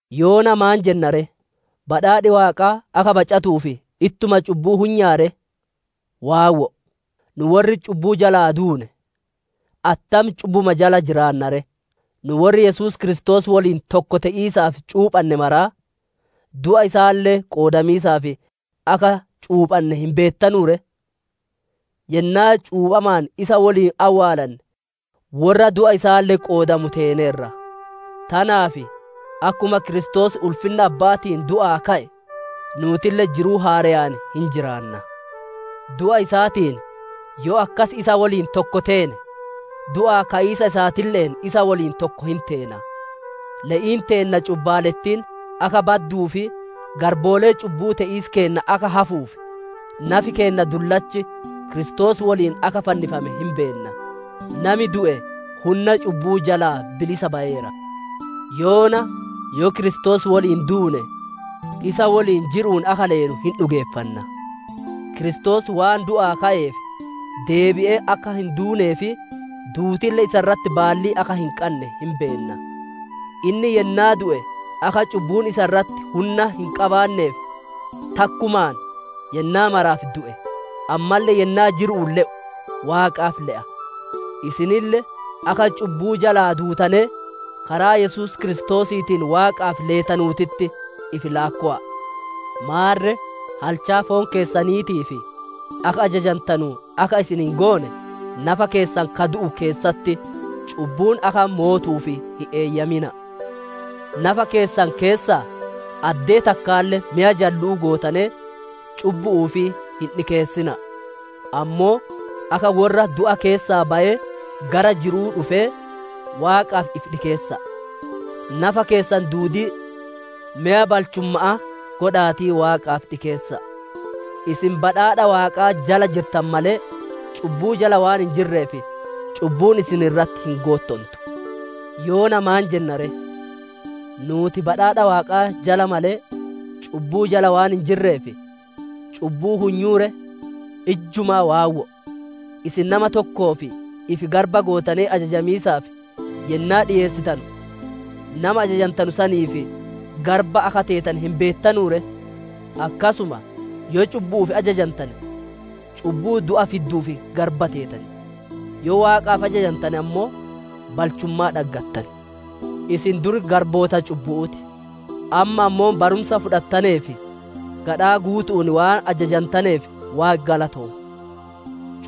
Yoona maan jenna ree? Badhaadhi Waaqaa akka bacatuuf ittuma cubbuu hunyaa ree? Waawwo'o! Nu worri cubbuu jalaa duune, attam cubbuma jala jiraanna ree? Nu worri Yesuus Kiristoos woliin tokko te'iisaaf cuuphanne maraa, du'a isaalle qoodamiisaaf akka cuuphanne hin beettanuu ree? Yennaa cuuphamaan isa woliin awwaalanne, worra du'a isaalle qoodamu teeneerra; tanaaf akkuma Kiristoos ulfinna Abba'aatiin du'aa ka'e, nuutille jiruu haareyaan hin jiraanna. Du'a isaatiin yoo akkas isa woliin tokko teene, du'aa ka'iisa isaatille'een isa woliin tokko hin teena. Le'iin teenna cubbaalettiin akka badduu fi garboolee cubbu'uu te'iis keenna akka hafuuf, nafi keenna dullachi Kiristoos woliin akka fannifame hin beenna. Nami du'e hunna cubbu'uu jalaa bilisa bayeera. Yoona yoo Kiristoos woliin duune, isa woliin jiru'uun akka leenu hin dhugeeffanna. Kiristoos waan du'aa ka'eef, deebi'ee akka hin duunee fi duutille isa irratti baallii akka hin qanne hin beenna. Inni yennaa du'e akka cubbuun isa irratti hunna hin qabaanneef, takkumaan yennaa maraaf du'e; ammalle yennaa jiru'uun le'u, Waaqaaf le'a. Isinille akka cubbuu jalaa duutanee, karaa Yesuus Kiristoosiitiin Waaqaaf leetanuutitti ifi laakkowa'a. Maarre halchaa foon keessaniitiif akka ajajantanu akka isin hin goone, nafa keessan ka du'u keessatti cubbuun akka mootuuf hin eeyyamina'a. Nafa keessan keessaa addee takkaalle meya jallu'uu gootanee cubbu'uuf hin dhikeessina'a; ammoo akka worra du'a keessaa bayee gara jiru'uu dhufee, Waaqaaf ifi dhikeessa'a; nafa keessan duudii meya balchumma'aa godha'aatii Waaqaaf dhikeessa'a. Isin badhaadha Waaqaa jala jirtan malee, cubbuu jala waan hin jirreef, cubbuun isin irratti hin goottontu. Yoona maan jenna ree? Nuuti badhaadha Waaqaa jala malee, cubbuu jala waan hin jirreef, cubbuu hunyuu ree? Ijjumaa waawwo'o! Isin nama tokkoof ifi garba gootanee ajajamiisaaf yennaa dhiyeessitanu, nama ajajantanu saniif garba akka teetane hin beettanu ree? Akkasuma yoo cubbu'uuf ajajantane, cubbuu du'a fidduuf garba teetan; yoo Waaqaaf ajajantane ammoo balchummaa dhaggatan. Isin dur garboota cubbu'uu ti; amma ammoo barumsa fudhattaneef gadhaa guutu'uun waan ajajantaneef, Waaqi galatoomu.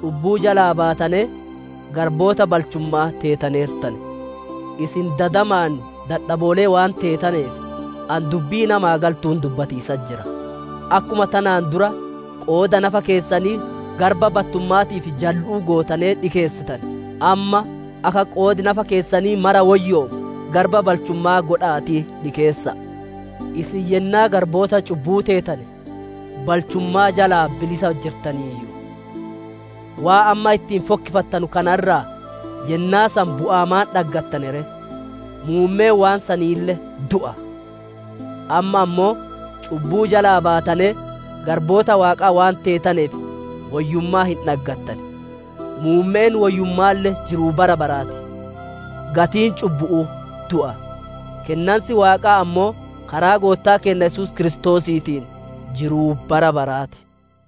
Cubbuu jalaa baatanee garboota balchumma'aa teetaneertan. Isin dadamaan dadhaboolee waan teetaneef, ani dubbii namaa galtuun dubbatiisatti jira. Akkuma tanaan dura qooda nafa keessanii garba battumma'aatii fi jallu'uu gootanee dhikeessitane, amma akka qoodi nafa keessanii maraa woyyoomu garba balchumma'aa godha'aatii dhikeessa'a. Isin yennaa garboota cubbu'uu teetane, balchummaa jalaa bilisa jirtaniiyyu. Waan amma ittiin fokkifattanu kana irraa yennaa san bu'aa maan dhaggattane ree? Muummeen waan saniille du'a! Amma ammoo cubbuu jalaa baatanee garboota Waaqaa waan teetaneef woyyummaa hin dhaggatan; muummeen woyyumma'aalle jiruu bara baraa ti. Gatiin cubbu'uu du'a; kennansi Waaqaa ammoo karaa Goottaa keenna Yesuus Kiristoosiitiin jiruu bara baraa ti.